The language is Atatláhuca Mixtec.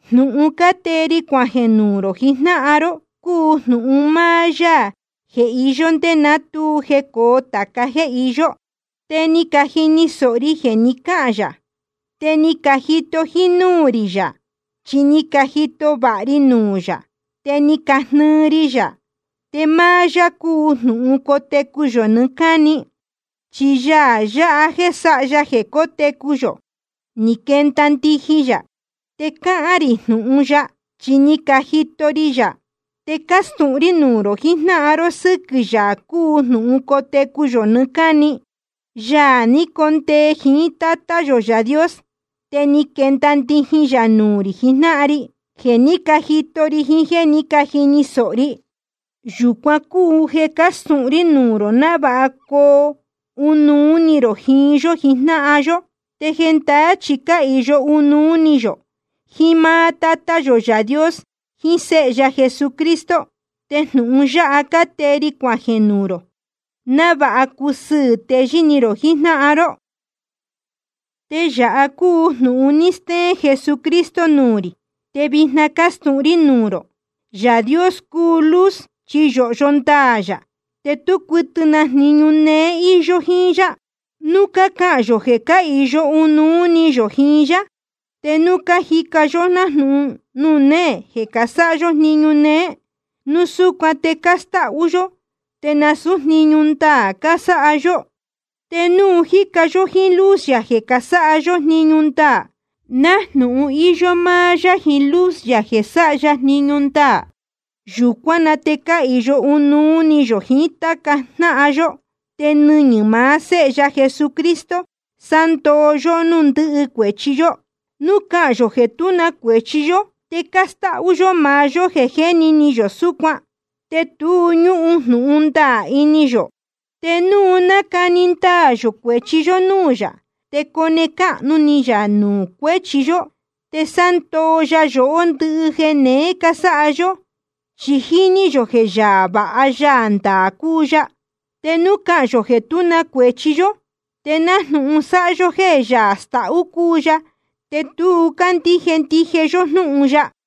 Jnūhun cátee ri cuajeē nuū rō jijnáhan ró cúu jnūhun máá Yaā jeē je íyó ndé ná tu jecōo tāca jéē iyó. Te ni cajini sōho ri jeē ni cáhān yā, te ni cajito jínúū rī yā, chi ni cajito vāha ri nuū yā, te ni cajnɨɨ ri yā. Te máá yá cúu Jnūhun cotecu yō nɨɨ́ cáni. Chi Yaā yáha jéē sáha ya jeē cótecu yō, ni quenda ndijin yā. Te cácahān rī jnūhun ya, chi ni cajito ri yā. Te cácastūhun rí nuū rō jijnáhan ró sɨ́quɨ̄ Yaā cúu Jnūhun cotecu yō nɨɨ́ cáni, Yaā ni condee jiín Tátá yō Yaā Dios, te ni quenda ndijin yā nuū rī jijnáhan ri. Jeē ní cajito ri jiín jéē ní cajini sōho ri, yūcuan cúu jeē cácastūhun rí nuū rō, návāha coo ɨnuú ni rō jiín yó jijnáhan yó. Te jendaá chi cáhīyo ɨnuú ni yō jiín máá Tátá yō Yaā Dios jiín Séhe ya Jesucristo. Te jnūhun yáha cátee ri cuajeē nuū rō, návāha cusɨɨ̄ teyɨ́ ni rō jijnáhan ró. Te yāha cúu jnūhun ni steén Jesucristo nuū rī, te vijna cácastūhun rí nuū rō: Yaā Dios cúu luz, chi yōhyo ndaā yā, te tú cuɨtɨ na jniñu néé íyó jíín yá. Núu cácahān yō jeē cáhīyo ɨnuú ni yō jiín yá, te núu cájica yó nájnūhun nuū néē jeē sáha yó jniñu néé, núu súcuan te cástáhú yó, te nasūú jniñu ndaā casáha yó. Te núu cájica yó jíín luz yā jeē casáha yó jniñu ndaā, nájnūhun íyó máá yá jiín luz yā jeē sáha ya jniñu ndaā, yūcuán na te cáhīyo ɨnuú ni yō jiín táca jnáhan yó. Te nɨñɨ̄ maá Séhe ya Jesucristo sándoo yóhó núū ndɨhɨ cuēchi yó. Núu cácahān yō jeē tú na cuēchi yó, te cástáhú yó maá yó jeē jéni ni yō súcuan, te tu ñúhun jnūhun ndaā ini yō. Te núu nacani ndaā yō cuēchi yó núū yā, te cone cáhnu ni yā nuū cuéchi yó, te sándoo ya yohó ndɨhɨ jeē neé cásáha yó. Chi jíní yō jeē Yaā vāha Yaā ndaā cúu ya. Te núu cácahān yō jeē tú na cuēchi yó, te nájnūhun sáha yó jéē Yaā stahú cúu ya, te tu cándíje ndije yó jnúhun ya.